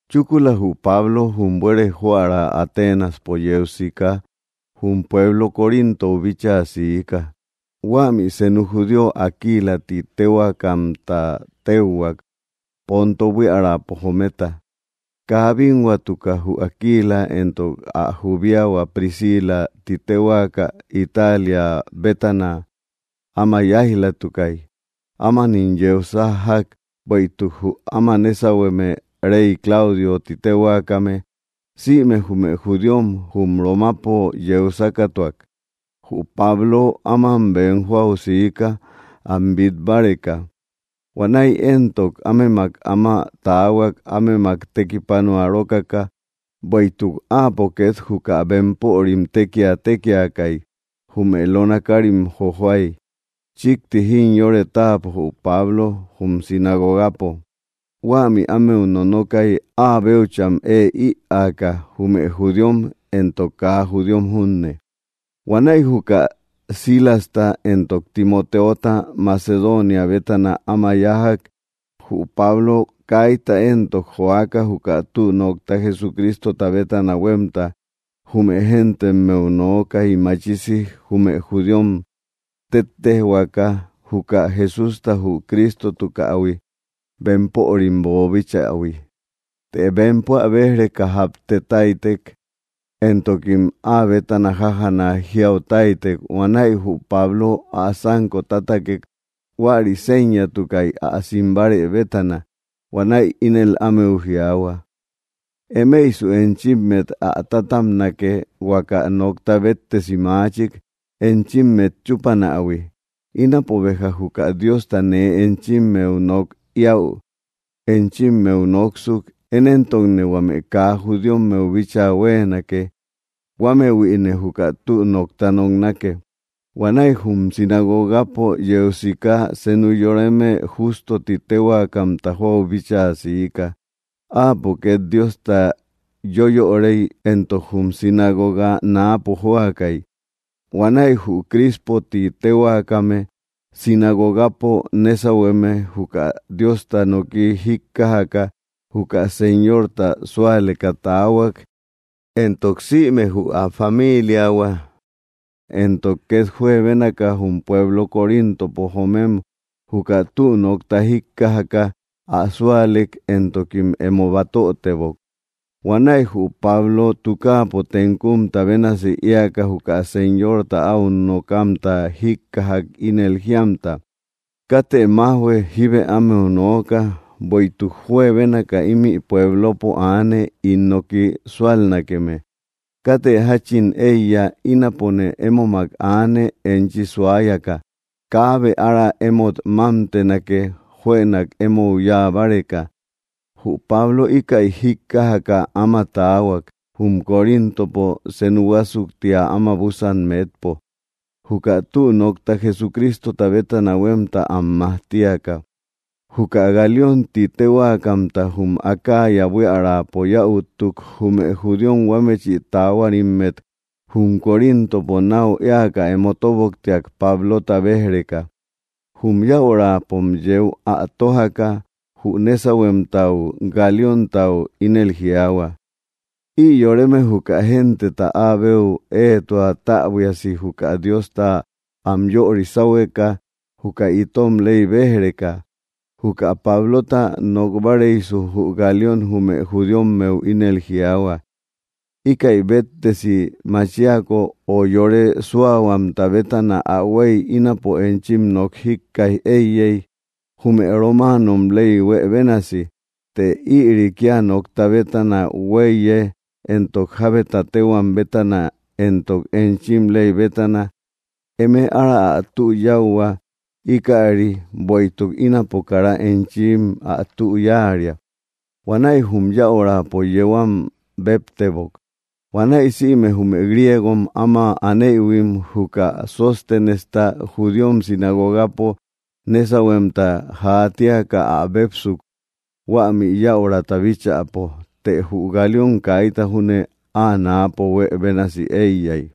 Chúkula, jü Pablo jum buere joära Atenaspo yeu siká jum pueblo Corintou bíchaa siika. Huämi senu judío Aquilä ti téhuakamta téuhuak, Ponto buíaräpo jometa. Kaa bínhuatuka jü Aquila éntok ä jubíahua Priscilä ti téhuaka Italia bétana áma yáij‑latukai. Ámanim yeu sájjak bueïtuk jü áma nésauhueme, rey Claudio ti téhuakame, sïme jume judíom jum romapo yeu sákatuak. Jü Pablo áman bem joau siika am bit báreka. Huanäi éntok ámemak áma taahuak ámemak tekipanua rókaka, bueïtuk áapo ket juka bempörim tekia tékiakai, jume lona kárim jojoai. Chikti jimyore táapo jü Pablo jum sinagogapo. Huämi ámeu nonokai áa béucham ëe íaaka, jume judíom éntok kaa judíom junne. Huanäi juka Silasta éntok Timotéota Macedonia bétana áma yájak, jü Pablo kaita éntok joaka juka tü nokta Jesucrístota bétana huemta jume géntemmeu nookai, machisi jume judíom tettéjhuaka juka Jesústa jü Crístotukähui bempörim boobíchähui. Të bempo ä béj‑reka japtetáitek, éntokim áa bétana jájana jiautáitek. Huanäi jü Pablo ä sanko tátakek; huäri séñatukai ä simbárë bétana. Huanäi ínel ámeu jiaahua: —Emeisu enchímmet ä tátabnake huaka nokta bétesi machik enchímmet chúpanähui. Ínapo béja juka Diosta nee enchimmeu nok ïäu enchimmeu nóksuk. Én éntokne huame kaa judíommeu bíchaa huéenake; huámëhuïne juka tü nokta noknake. Huanäi jum sinagogapo yeu siká senu yoreme Jústo ti téhuakamta joau bíchaa siika. Áapo ket Diosta yöyorei éntok jum sinagoga naapo jóakai. Huanäi jü Crispö ti téhuakame, sinagogapo nésauhueme, juka Diosta noki jíkkajaka juka Señorta súaleka taahuak éntok sïme jü ä famíliahua. Éntok ket juebénaka jum pueblo Coríntopo joomem juka tü nokta jíkkajaka ä súalek, éntokim emo batötebok. Huanäi jü Pablo tukáapo tenkumta bénasi éaka juka Señorta au nokamta jíkkajak ínel jíamta: —Kátë majhuë. Jíbë ámeu nooka, bueïtuk juebénaka ímï puéblopo aane ín noki súalnakeme. Kátë jachin eiya. Ínapone émomak aane enchi suáyaka. Kaabe ára émot mámtenake juënak emou yáa báreka. Jü Pablo íkäi jíkkajaka áma taahuak jum Coríntopo senu huásuktia áma busan metpo, juka tü nokta Jesucrístota bétana huemta am majtíaka. Juka Galión ti téhuakamta jum Acaya buíaräpo yäuttuk, jume judíom huámechi taáhuarimmet jum Coríntopo nau éaka emo tóboktiak Pablota béj‑reka. Jum yäuraapom yéu ä tójaka jü nésauhuemtau, Galióntau, ínel jiaahua: —Ï yoreme juka genteta áa béu éetua täbuiasi juka Diosta am yöri sáhueka, juka itom ley bej-reka. Juka Pablota nok báareisu, jü Galión jume judíommeu ínel jiaahua: —Íkäi béttesi machíako, o yore súahuamta bétana ä huei, ínapo enchim nok jíkkaij éiyey, jume romáanom ley huë bénasi. Të ïri kia nokta bétana huéiye éntok jábeta téhuam bétana éntok enchim ley bétana. Eme ára ä tü yáuhua íkäri, bueïtuk ínapo kara enchim ä tü yáaria. Huanäi jum yäurapo yéu am bébtebok. Huanäi sïme jume griégom áma anéïhuim juka Sostenesta, judíom sinagogapo nésauhuemta jaatíaka ä bépsuk huämi yäurata bíchäpo. Të jü Galión kaita júne áa náapo huë bénasi eiya.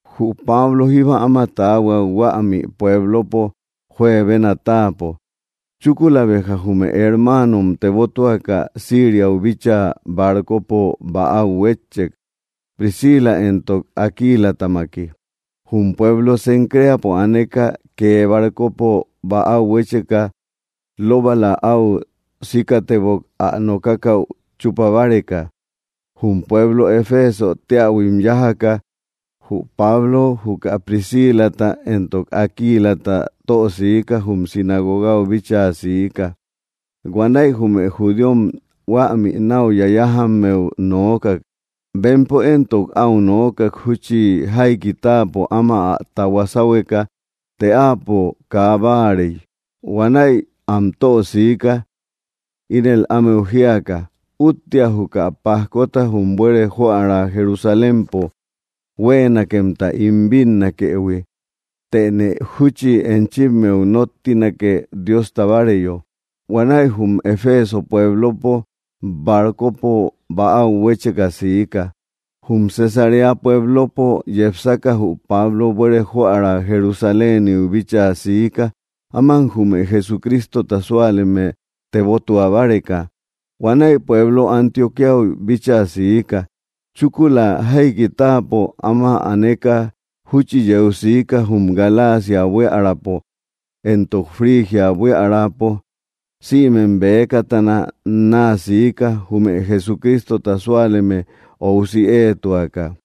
Jü Pablo jíba áma taahuak huämi puéblopo juebena táapo. Chúkula béja jume hermáanom tebótuaka Síriau bíchaa barcopo bäau huétchek Priscila éntok Aquílätamaki. Jum pueblo Cencréapo aneka, kee barcopo bäau huécheka, lóbala au síkatebok ä nokákäu chupa báreka. Jum pueblo Efésö teähuim yájaka, jü Pablo juka Priscílata éntok Aquilata tösiká jum sinagogau bíchaa siika. Huanäi jume judíom huämi nau yayájammeu noókak. Bempo éntok, au noókak júchi jaiki táapo áma ä tahuá sáhueka, të áapo kaa báarei. Huanäi am tösiika ínel ámeu jíaka: —Úttea juka pajkota jum buere joära Jerusalémpo huéenakemta ín bínnakëhui, tëne júchi enchimmeu nóttinake Diosta báareyo. Huanäi jum Eféso pueblopo barcopo bäau huécheka siika. Jum Cesaréa pueblopo yepsaka jü Pablo buere joära Jerusaléniu bíchaa siika áman jume Jesucrístota súaleme tebótua báreka. Huanäi pueblo Antioquíau bíchaa siika. Chúkula jaiki táapo áma aneka, júchi yeu siká jum Galacia buíaräpo éntok Frigia buiärapo sïmem bekatana naa siika jume Jesucristota súaleme óusi éetuaka.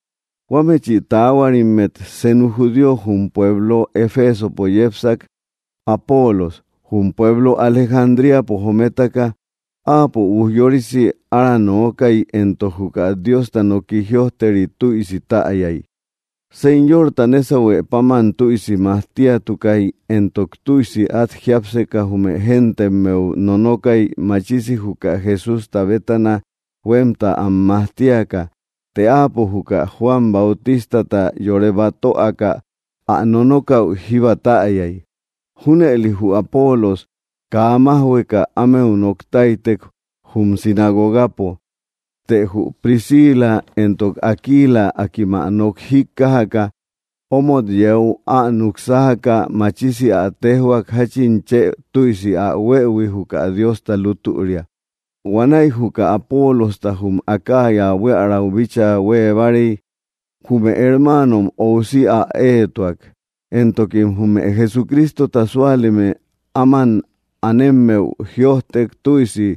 Huámechi taáhuarimmet senu judío jum pueblo Efesopo yépsak Aapolos, jum pueblo Alejandríapo jométaka. Áapo ujyorisi ára nookai, éntok juka Diosta noki jïojteri tüisi täyai. Señorta nésahue páman tüisi majtíatukai, éntok tüisi at jiápseka jume géntemmeu nonokai, machisi juka Jesústa bétana huemta am majtíaka. Të áapo juka Juan Bautístata yore batöaka ä nonókäu jíba täyai. Júnëli jü Apolos kaa májhueka ámeu noktáitek jum sinagogapo. Të jü Priscila éntok Aquila, akím ä nok jíkkajaka, omot yéu ä nuk sájaka machisi ä téjhuak jachin chë tüisi ä huëhui juka Diosta lútüria. Huanäi juka Apoolojta jum Acaya buiärau bíchaa huee báarei, jume hermáanom óusi ä éetuak, éntokim jume Jesucrístota súaleme áman anemmeu jïojtek tüisi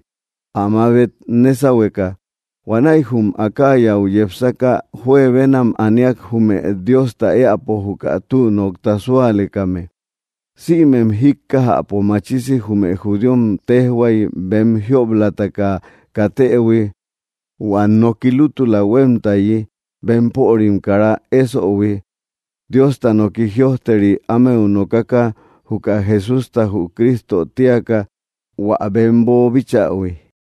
ä mabet nésauhueka. Huanäi jum Acayau yepsaka juebénam aníak jume Diosta éäpo juka tü nokta súalekame. Sïmem jíkkajäpo machisi jume judíom tejhuai bem jióblataka katëhui hua nooki lútula huémtaayi bempörim kara éssöhui, Diosta noki jïojteri ámeu nokaka juka Jesústa jü Crísto tíaka hua bem boobíchähui.